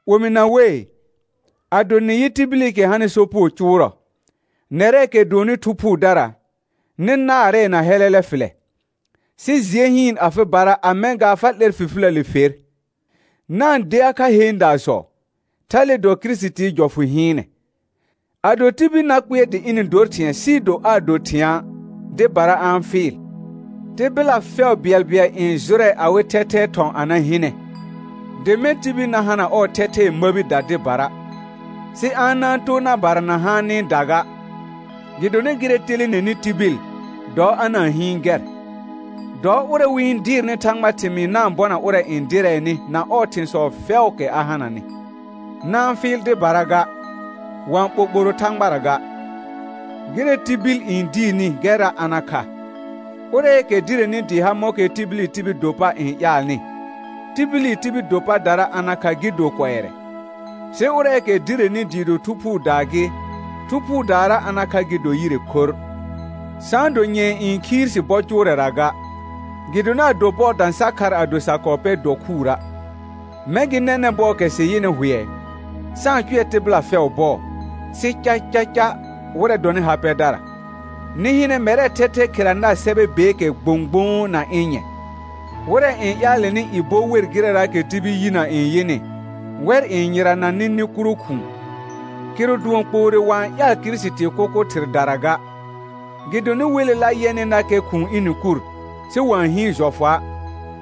Omɩna wei, ado nɩ yɩ tibilikɛ hanɩ sopugo cʋʋrɔ, nɛrɛɛkɛ dʋɔnnɩ Thu Phuudara nɩ naarɛɛ na hɛlɛlɛ fɩlɛ, sɩ jɩɛ hɩɩn afɩbara a mɛ̃ gaa fa 'lɛr fifiləle fer. Na-n dea kha heendaasɔ, thale dɔ Kirisitii jɔfʋ hɩɩnɛ. Ado tibil na kpɩɛr dɩ ɩnɩ dor thɩ̃ɛ sɩɩ do aa do thɩ̃a', dɩbara a-n fɩɩl. Tɩbɩla fɛʋ bɩɛlbɩɛl n jʋrɛ awɩ thɛthɛɛ thɔ̃ a na hɩnɛ, dɩ mɛ̃ tibil na hana ɔɔ thɛthɛɛ məbida dɩbara, sɩ a na-n too na barana haanɩda ga; gɩdonɩ gɩrɛ telenenɩ tibil, dɔ a na-n hɩɩn gɛr. Dɔ ʋrɛ wɩ-n dɩɩrnɩ Thãgbaa thɩmɩɩ na-n bɔna ʋrɛ n dɩrɛɛnɩ na ɔɔ thɩ̃sɔ fɛʋʋkɛ a hananɩ. Na-n fɩɩl dɩbara ga; wa-n ɓoɓoro Thãgbara ga, gɩrɛ tibil n diirni gɛrra a na kha. Ʋrɛɛkɛ direni dɩɩ ha mɔ̃kɛ tibili tibil do pa n ƴaalnɩ, tibili tibil do padara a na kha gɩ do kʋɛrɛ, sɩ ʋrɛɛkɛ direni dɩɩ do Thu Phuudaa gɩ, Thu Phuudaara a na kha gɩ do yire khorr. Sa-n do nyɛ̃ɛ n khiir si bɔ cʋʋrɛra ga, gɩdonɩ ado bɔɔ dã sa khar ado sa kɔɔ pɛr dokhʋʋra'. Mɛ̃ gɩ nɛnɛ̃ bɔɔkɛ sɩ yɩnɩ hʋɛ, sa-n cʋɛ tɩbɩla fɛʋ bɔɔ, sɩ cacaca wɩrɛ dɔnɩ ha pɛdara. Nɩ hɩnɛ mɛrɛɛ thɛthɛ khera nar sɛbɛ beekɛ gbõgbõo na ɩ̃ nyɛ̃. Wɩrɛ n ƴaalɛnɩ i bɔ wer gɩrɛraakɛ tibil yinə n yɩnɩ, wɛr n yɩrana nɩ nɩ kuro khʋ̃ʋ, kɩrʋ dʋɔn kpoore wa-n ƴaal Kirisitii kʋkʋ thɩrdara ga. Gɩdonɩ welela yɛnɩnakɛ khʋ̃ʋ ɩnɩ kur, sɩ wa-n hɩɩn jɔfʋa',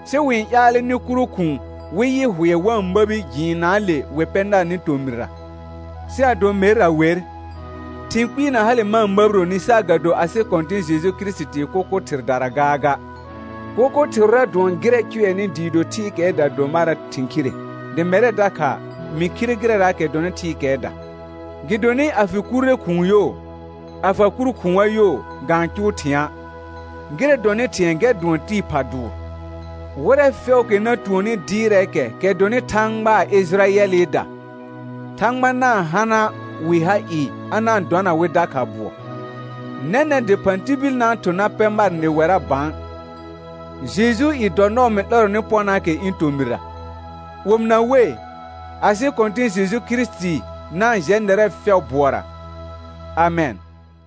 sɩ wɩ-n ƴaalɛ nɩ kuro khʋ̃ʋ wɩ yɩ hʋɛ wa-n məbi jɩɩnnaale wɩ pɛ narnɩ tomɩrra. Sɩ ado merra wer, thɩ̃ kpɩɩ na hale ma-n məbironi saagado asɩ Kɔ̃tɩ̃ Jeju Kirisitii kʋkʋ thɩrdara gaaga. Kʋkʋ thɩrʋra dʋɔn gɩrɛ cʋɛnɩ dɩɩ do thɩɩkɛɛda do marɛ thɩ̃ khire dɩ mɛrɛ dakha mɩ khire gɩrɛraakɛ dɔnɩ thɩɩkɛɛda. Gɩdonɩ a fɩ kurre khʋ̃ʋ yo, a fa kur khʋ̃a yo, ga-n cʋʋ thɩ̃a', gɩrɛ dɔnɩ thɩ̃ɛ gɛr dʋɔn tɩɩ pha dʋʋr. Wɩrɛ fɛʋʋkɛ na tuonni dɩɩrɛɛkɛ kɛ dɔnɩ Thãgbaa Ɩjɩrayɛlɩda, Thãgba na-n hana wɩ ha ɩɩ a na-n dɔna wɩ dakha bʋɔ. Nɛnɛ̃ dɩphã tibil na-n thʋ̃ na pɛ mar nɩwɛra bã, Jejuu i dɔ nɔɔ mɩ 'lɛrɔnɩ pɔnaakɛ ɩ̃ tomɩra. Omɩna wei, asɩ Kɔ̃tɩ̃ Jeju Kirisiti na-n jɛ nɛrɛ fɛʋ bʋɔra. Amɛn.